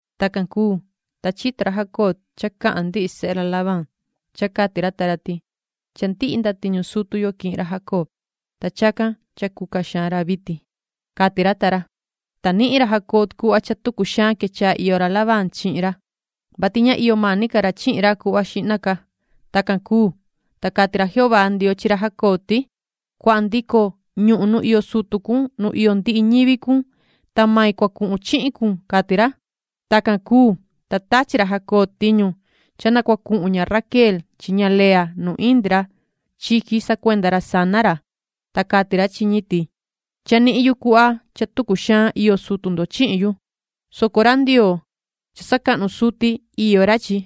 Tacan cuu, ta chito ra Jacob cha cahan ndihi sehe ra Labán, cha cati ra ta ra ti: “Cha ndihi ndatiñu sutu yo quihin ra Jacob, ta chacan cha cuca xaan ra vitin”, cati ra ta ra. Ta nihin ra Jacob cuhva cha tucu xaan quechaha iyo ra Labán chihin ra, vati ña iyo mani ca ra chi ra cuhva xihna ca. Tacan cuu, ta cati ra Jehová Ndioo chi ra Jacob ti: “Cuahan ndico ñuhun nu iyo sutu cun nu iyo ndihi ñivi cun, ta main cua cuhun chihin cun”, cati ra. Tacan cuu, ta tachi ra Jacob tiñu cha na cua cuhun ña Raquel chi ña Lea nu indi ra chiqui sacuenda ra sana ra, ta cati ra chi ñi ti: ―Cha nihin yu cuhva cha tucu xaan iyo sutu ndo chihin yu, soco ra Ndioo, cha sacahnu suti, iyo ra chi,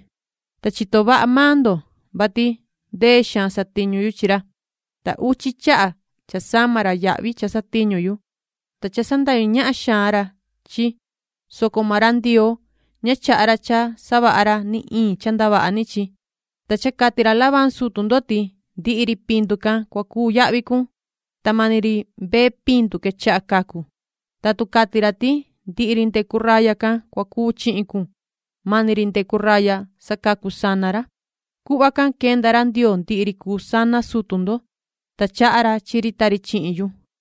ta chito vaha maan ndo, vati ndee xaan satiñu yu chi ra, ta uchi chaha cha sama ra yahvi cha satiñu yu, ta cha sandahyu ñahan xaan ra chi, soco maan ra Ndioo, ña chaha ra cha savaha ra ni iin cha ndavaha ni chi. Ta cha cati ra Labán sutu ndo ti: ‘Ndihi ri pindu can cua cuu yahvi cun’, ta mani ri mbee pindu quechaha cacu, ta tu cati ra ti: ‘Ndihi ri ndecu raya can cua cuu chihin cun’, mani ri ndecu raya sacacu sana ra. Cuhva can quenda ra Ndioo ndihi ri cuu sana sutu ndo, ta chaha ra chi ri ta ri chihin yu.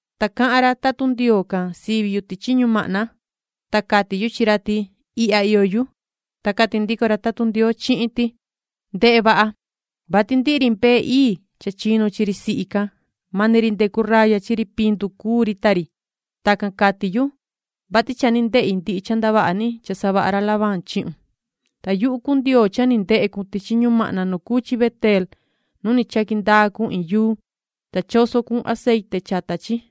Ta cahan ra tatun Ndioo can sivi yu tichi ñumahna, ta cati yu chi ra ti: ‘Ihya iyo yu’. Ta cati ndico ra tatun Ndioo chihin ti: ‘Ndehe vaha, vati ndihi ri ii cha chinu chi ri sihi can, mani ri ndecu raya chi ri pindu cuu ri ta ri. Tacan cati yu, vati cha ni ndehi ndihi cha savaha ra Labán chihun. Ta yuhu cuu Ndioo cha ni ndehe cun tichi ñumahna nu cuu chi Beteel nu ni chaqui ndaa cun iin yuu, ta choso cun aceite chata chi,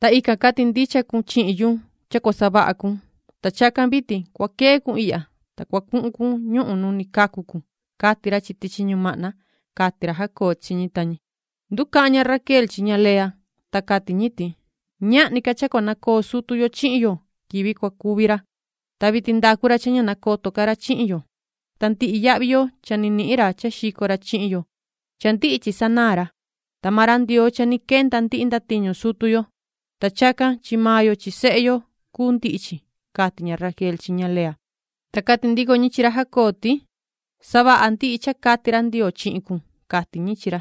ta ican cati ndicha cun chihin yu cha cua savaha cun. Ta chacan vitin cua quee cun ihya, ta cua cuhun cun ñuhun nu ni cacu cun’, cati ra chi tichi ñumahna ―cati ra Jacob chi ñi ta ñi. Nducahan ña Raquel chi ña Lea, ta cati ñi ti: ―Ñahni ca cha cua nacoo sutu yo chihin yo na cua cuvi ra. Ta vitin ndacu ra cha ña nacoto ca ra chihin yo. Ta ndihi yahvi yo cha ni nihin ra cha xico ra chihin yo, cha ndihi chi sanaan ra. Ta maan ra Ndioo cha ni quenda ndihi ndatiñu sutu yo, ta chacan chi maan yo chi sehe yo cuu ndihi chi ―cati ña Raquel chi ña Lea. Ta cati ndico ñi chi ra Jacob ti: ―Savaha ndihi cha cati ra Ndioo chihin cun ―cati ñi chi ra.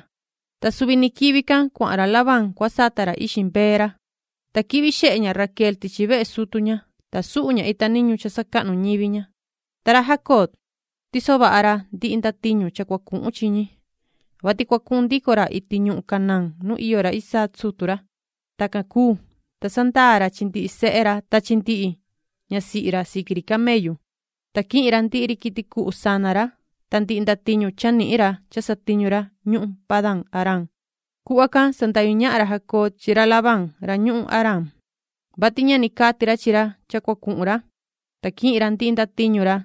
Ta suvi ni quivi can, cuahan ra Labán cua sata ra ixi mbee ra, ta quihvi xehe ña Raquel tichi vehe sutu ña, ta suhu ña ita niñu cuati cha sacahnu ñivi ña. Ta ra Jacob, tiso vaha ra ndihi ndatiñu cha cua cuhun chi ñi, vati cua cuhun ndico ra iti ñuhun Canaán nu iyo ra Isaac sutu ra. Tacan cuu, ta sandaa ra chi ndihi sehe ra ta chi ndihi ñasihi ra siqui ri camellu. Ta quihin ra ndihi ri quiti cuhu sana ra ta ndihi ndatiñu cha nihin ra cha satiñu ra ñuhun Padan-aram. Cuhva can sandahyu ñahan ra Jacob chi ra Labán ra ñuhun Aram, vati ña ni cati ra chi ra cha cua cuhun ra, ta quihin ra ndihi ndatiñu ra,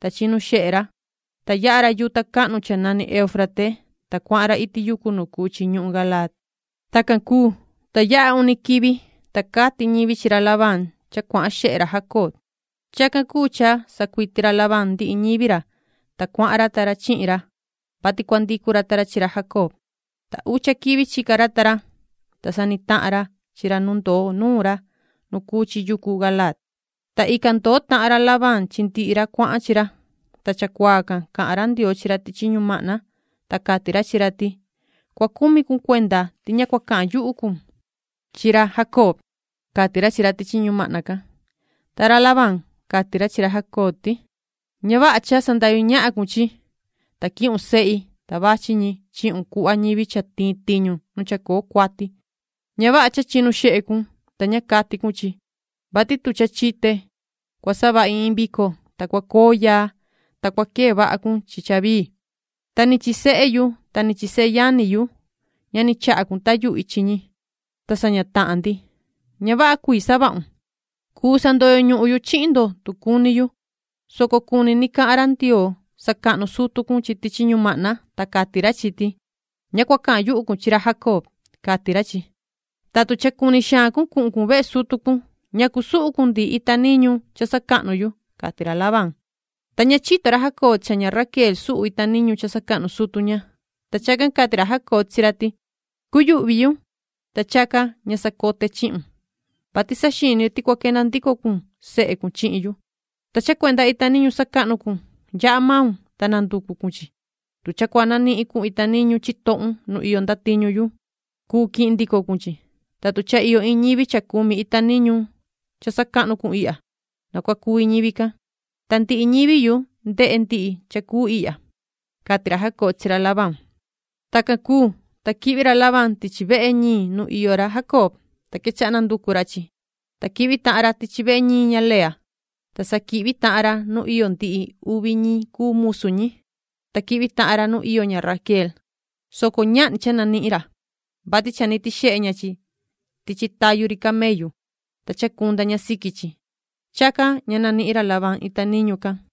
ta chinu xehe ra, ta yaha ra yuta cahnu cha nani Euufrate, ta cuahan ra iti yucu nu cuu chi ñuhun Galaad. Tacan cuu, ta yaha uni quivi, ta cati ñivi chi ra Labán cha cuahan xehe ra Jacob. Chacan cuu cha sacuiti ra Labán ndihi ñivi ra, ta cuahan ra ta ra chihin ra, vati cua ndicu ra ta ra chi ra Jacob. Ta ucha quivi chica ra ta ra, ta sa ni tahan ra chi ra nu ndoo nuun ra nu cuu chi yucu Galaad. Ta ican ndoo tahan ra Labán chi ndihi ra cuahan chi ra. Ta chacuaa can cahan ra Ndioo chi ra tichi ñumahna, ta cati ra chi ra ti: “Cua cumi cun cuenda ti ña cua cahan yuhu cun chi ra Jacob”, cati ra chi ra tichi ñumahna can. Ta ra Labán, cati ra chi ra Jacob ti: ―Ña vaha cha sandahyu ñahan cun chi, ta quihun sehi, ta vachi ñi chihun cuhva ñivi cha tiin tiñu nu chacoo cuati. Ña vaha cha chinu xehe cun, ta ña cati cun chi, vati tu cha chite, cua savahi iin vico, ta cua coo yaa, ta cua quee vaha cun chi cha vii. Ta ni chi sehe yu ta ni chi seyani yu, ña ni chaha cun cha tayuhi chi ñi, ta saña tahan ndi. ¡Ña vaha cuii savahun! Cuu sandoyo ñuhun yu chihin ndo tu cuni yu, soco cuni ni cahan ra Ndioo sacahnu sutu cun chi tichi ñumahna, ta cati ra chi ti: ‘Ña cua cahan yuhu cun chi ra Jacob’, cati ra chi. Ta tu cha cuni xaan cun cuhun cun vehe sutu cun, ¿ñacu suhu cun ndihi ita niñu cha sacahnu yu? ―cati ra Labán. Ta ña chito ra Jacob cha ña Raquel suhu ña ita niñu cha sacahnu sutu ña. Ta chacan cati ra Jacob chi ra ti: ―Cuyuhvi yu, ta chacan ña sacote chihun, vati saxini yu ti cua quenda ndico cun sehe cun chihin yu. Ta cha cuenda ita niñu sacahnu cun, yaha maun, ta nanducu cun chi. Tu cha cua nanihin cun ita niñu chitohun nu iyo ndatiñu yu, cuu quihin ndico cun chi. Ta tu cha iyo iin ñivi cha cumi ita niñu cha sacahnu cun ihya, na cua cuvi ñivi can, ta ndihi ñivi yu ndehe ñi cuenda chehe ―cati ra Jacob chi ra Labán. Tacan cuu, ta quihvi ra Labán tichi vehe ñiin nu iyo ra Jacob, ta quechaha nanducu ra chi. Ta quihvi tahan ra tichi vehe ñiin ña Lea, ta sa quihvi tahan ra nu iyo ndihi uvi ñi cuu musu ñi, ta quihvi tahan ra nu iyo ña Raquel, soco ñahni cha nanihin ra, vati cha ni tixehe ña chi tichi tayu ri camellu, ta chacunda ña siqui chi. Chacan ña nanihin ra Labán ita niñu cuati can,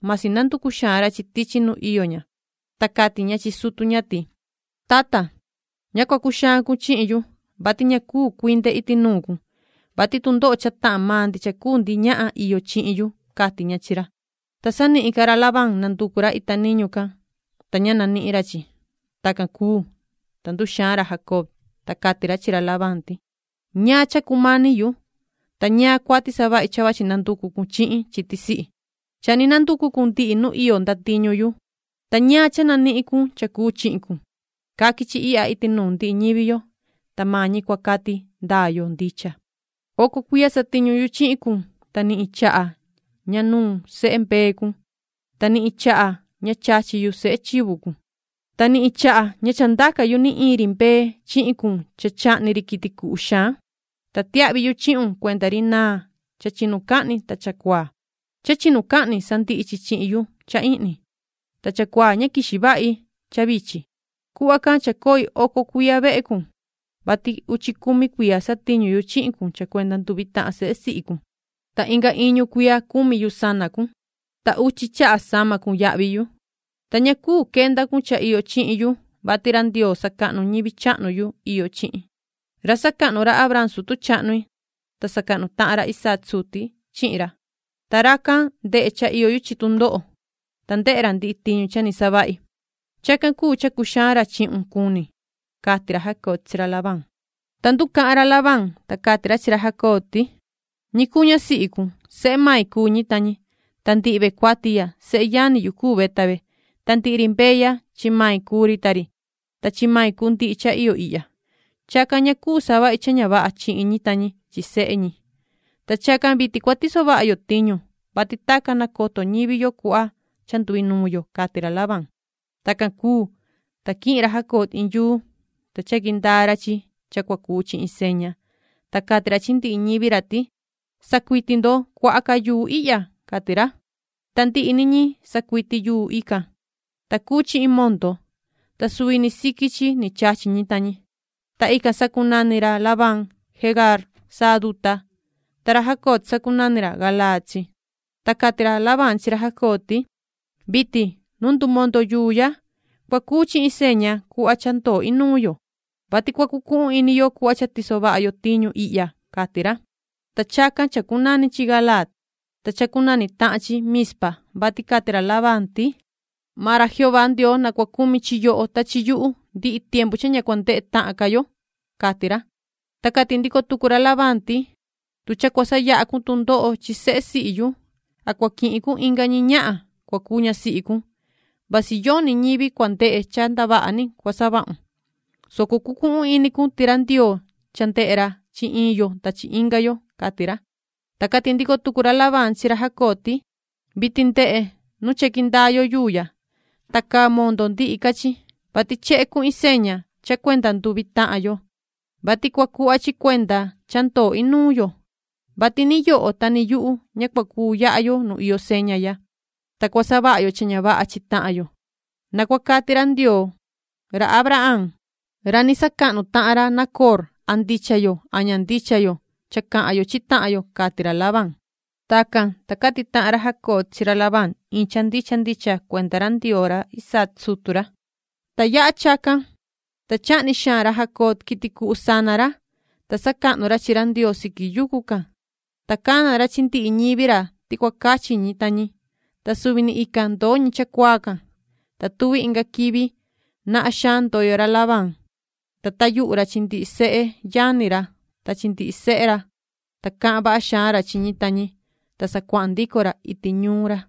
masi nanducu xaan ra chi tichi nu iyo ña. Ta cati ña chi sutu ña ti: ―Tata, ña cua cuxaan cun chihin yu, vati ña cuu cuinde iti nuun cun, vati tundoho cha tahan maan ndi cha cuu ndi ñahan iyo chihin yu ―cati ña chi ra. Ta sanihin ca ra Labán nanducu ra ita niñu cuati can, ta ña nanihin ra chi. Tacan cuu, ta nduxaan ra Jacob, ta cati ra chi ra Labán ti: ―¿Ñaan cha cumani yu, ta ñaan cuati savahi cha vachi nanducu cun chi chi tisihi? Cha nanducu cun ndihi nu iyo ndatiñu yu, ¿ta ñaan cha nanihin cun cha cuu chihin cun? Caqui chi ihya iti nuun ndihi ñivi yo, ta maan ñi cua cati ndaa yo ndicha. Oco cuiya satiñu yu chihin cun, ta ni iin chaha ña nuun sehe mbee cun, ta ni iin chaha ña chachi yu sehe chivu cun. Ta ni iin chaha ña cha ndaca yu ni iin ri mbee chihin cun cha chahni ri quiti cuhu xaan, ta tiahvi yu chihun cuenda ri naan cha chinucahni ta chacuaa. Cha chinucahni sandihi chi chihin yu cha ihni, ta chacuaa ña quixi vahi cha vichin. Cuhva can chacoi oco cuiya vehe cun, vati uchi cumi cuiya satiñu yu chihin cun cha cuenda nduvi tahan sehe sihi cun, ta inga iñu cuiya cumi yu sana cun, ta uchi chaha sama cun yahvi yu. Ta ña cuu quenda cun cha iyo chihin yu, vati ra Ndioo sacahnu ñivi chahnu yu iyo chihin, ra sacahnu ra Abraham sutu chahnu-i ta sacahnu tahan ra Isaac suti chihin ra. Ta racan ndehe cha iyo yu chi tundoho, ta ndehe ra ndihi tiñu cha ni savahi. Chacan cuu cha cuxaan ra chihun cuni ―cati ra Jacob chi ra Labán. Ta nducahan ra Labán, ta cati ra chi ra Jacob ti: ―Ñi cuu ñasihi cun, sehe main cuu ñi ta ñi, ta ndihi ve cuati ya, seyani yu cuu ve ta ve, ta ndihi ri mbee ya chi ri chivu ya chi main cuu ri ta ri, ta chi main cuu ndihi cha iyo ihya. Chacan ña cuu savahi cha ña vaha chihin ñi ta ñi chi sehe ñi. Ta chacan vitin cua tiso vaha yo tiñu, vati tacan nacoto ñivi yo cuhva cha nduinuun yo ―cati ra Labán. Tacan cuu, ta quihin ra Jacob iin yuu, ta chaqui ndaa ra chi cha cua cuu chi iin seña. Ta cati ra chi ndihi ñivi ra ti: ―Sacuiti ndo cuaha ca yuu ihya ―cati ra. Ta ndihi ni ñi sacuiti yuu ican, ta cuu chi iin mondo, ta suvi ni siqui chi ni chachi ñi ta ñi. Ta ican sacunani ra Labán “Jegaar Sahaduta”, ta ra Jacob sacunani “Galaad” chi. Ta cati ra Labán chi ra Jacob ti: ―Vitin, nu ndumondo yuu ya, cua cuu chi iin seña cuhva cha ndoo inuun yo, vati cua cucuhun ini yo cuhva cha tiso vaha yo tiñu ihya ―cati ra. Ta chacan chacunani chi Galaad. Ta chacunani tahan chi Mizpa, vati cati ra Labán ti: ―Maan ra Jehová Ndioo na cua cumi chi yoho ta chi yuhu ndihi tiempu cha ña cua ndehe tahan ca yo ―cati ra. Ta cati ndico tucu ra Labán ti: ―Tu cha cua sayaha cun tundoho chi sehe sihi yu, a cua quihun inga ñi ñahan cua cuu ñasihi cun, vasi yoni ñivi cua ndehe cha ndavaha ni cua savahun, soco cucuhun ini cun ti ra Ndioo cha ndehe ra chi iin yo ta chi inga yo ―cati ra. Ta cati ndico tucu ra Labán chi ra Jacob ti: ―Vitin ndehe nu chaqui ndaa yo yuu ya, ta caa mondo ndihi ca chi, vati chehe cuu iin seña cha cuenda nduvi tahan yo, vati cua cuhva chi cuenda cha ndoo inuun yo, vati ni yoho ta ni yuhu, ña cua cuu yaha yo nu iyo seña ya, ta cua savaha yo cha ña vaha chi tahan yo. Na cua cati ra Ndioo ra Abraham, ra ni sacahnu tahan ra Nacoor a ndicha yo a ña ndicha yo cha cahan yo chi tahan yo ―cati ra Labán. Tacan, ta cati tahan ra Jacob chi ra Labán iin cha ndicha ndicha cuenda ra Ndioo ra Isaac sutu ra. Ta yaha chacan, ta chahni xaan ra Jacob quiti cuhu sana ra, ta sacahnu ra chi ra Ndioo siqui yucu can, ta cana ra chi ndihi ñivi ra ti cua cachi ñi ta ñi, ta suvi ni ican ndoo ñi chacuaa can. Ta tuvi inga quivi, nahan xaan ndoyo ra Labán, ta tayuhu ra chi ndihi seyani ra ta chi ndihi sehe ra, ta cahan vaha xaan ra chi ñi ta ñi, ta sa cuahan ndico ra iti ñuun ra.